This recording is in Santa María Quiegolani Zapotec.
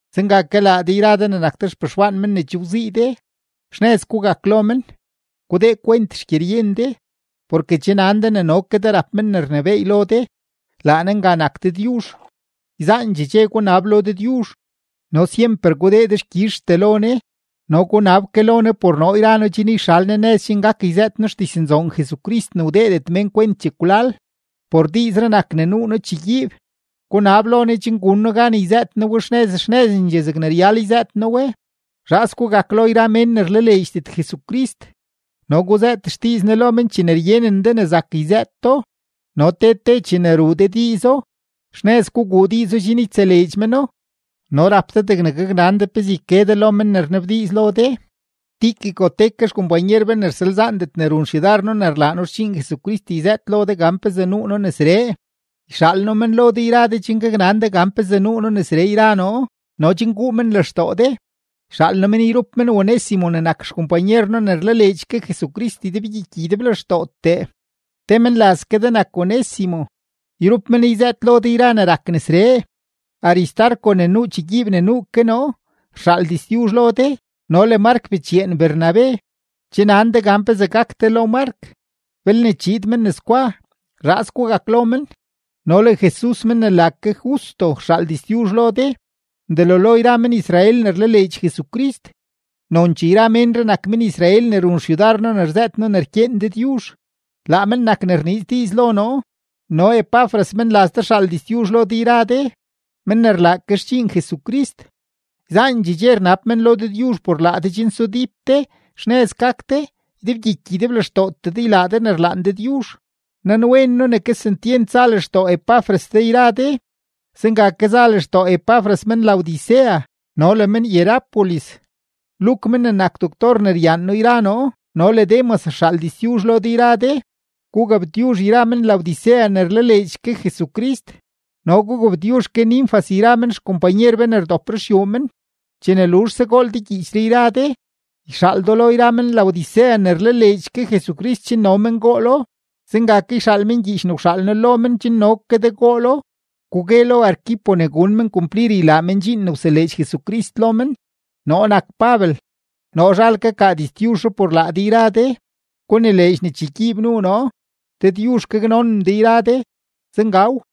Zenga ke laa de yra de ne nak de xpexwaan men ne che wzii de, xnëz gugak lo men, gudee kwent xgyeryen de, porke che nan de ne no ke de rap men ne rnebééy lo de; laa Ne nga nak Dëdyuzh. Yzaandxee dxe gunab lo Dëdyuzh no syemper gudee dexkyizhtee lo Ne. No gunab ke lo Ne por noo yra noo chen yxal Ne nëz chen gak yzëët noo xdiznzoon Jesucrist ne wdeedet mén kwent chekwlal. Por diizree nak ne nuu noo chegyiib. Gunab lo Ne chen gun noo gan yzëët noo we xnëz xnëzendxee zegne ryal yzëët noo we. Zhaas gugak lo yra mén ne rlaleedxdet Jesucrist no guzëët xdiiz Ne lo men chene ryenen de ne zak yzëëto. No te te chene ruu de diizo, xnëz guguu diizo chen ytseleedx meno no rap de degne gaknan de pezee yke de lo men ne rnabdiiz lo de. Tíquico te ke xkompanyer be ne rsalzaandet ne run xyudar noo ne rlaa noo xdxiin Jesucrist yzëët lo de gan pezee nuu noo nesree. Yxaal noo men lo de yra de chen gaknan de gan pezee nuu noo nesree yra noo no chen guu men lextoo de. Yxaal noo men yrup men Onésimo ne nak xkompanyer noo no ne rlaleedx ke Jesucrist ydebgyiky ydeblextootee, te menlaz ke de nak Onésimo. Yrup men yzëët lo de yra ne rak nesree. Aristarco ne nuu chegyiib ne nuu ke noo, rxaal diztyuzh lo de no le Mark bechyeen Bernabe. Che nan de gan pezee gak de lo Mark; belne chiid men nesgwa, zhaas gugak lo men. No le Jesus men ne la ke Justo rxaal diztyuzh lo de. Delo lo yra men-Israel ne rlaleedx Jesucrist, nonchee yra menree nak men-Israel ne run xyudar noo ne rzëët noo ne rkyeen Dëdyuzh, laa men nak ne rniiz diiz lo noo. No Epafras menlaz de rxaal diztyuzh lo de yra de, men ne rlaa ke xdxiin Jesucrist. Yzaandxee dxe rnab men lo Dëdyuzh por laa de chen sudíp de, xnëz gak de, ydebgyiky ydeblextootee de ylaa de ne rlaan Dëdyuzh. Nanwen noo ne kesentyent za lextoo Epafras de yra de, zenga ke za lextoo Epafras men-Laodicea no le men-Hierápolis. Luk men ne nak doctor ne ryaan noo yra noo no le Demas rxaal diztyuzh lo de yra de. Gugabtyuzh yra men-Laodicea ne rlaleedx ke Jesucrist no gugabtyuzh ke Ninfas yra men xkompanyer be ne rdop ruxyuu men. Chene luzhse gool de gyiichree yra de, yxaal do lo yra men-Laodicea ne rlaleedx ke Jesucrist chen no men goolo. Zenga ke yxaal men gyiich ne wxaal noo lo men chen no ke de goolo. Gugue lo Arquipo ne gun men kumplir ylaa men dxiin ne wseleedx Jesucrist lo men. Noo nak Pabel, noo zhal kakaa diztyuzhree por laa de yra de. Gunileedx ne chegyiib nuu noo. Dëdyuzh gaknonen de yra de. Zengaw.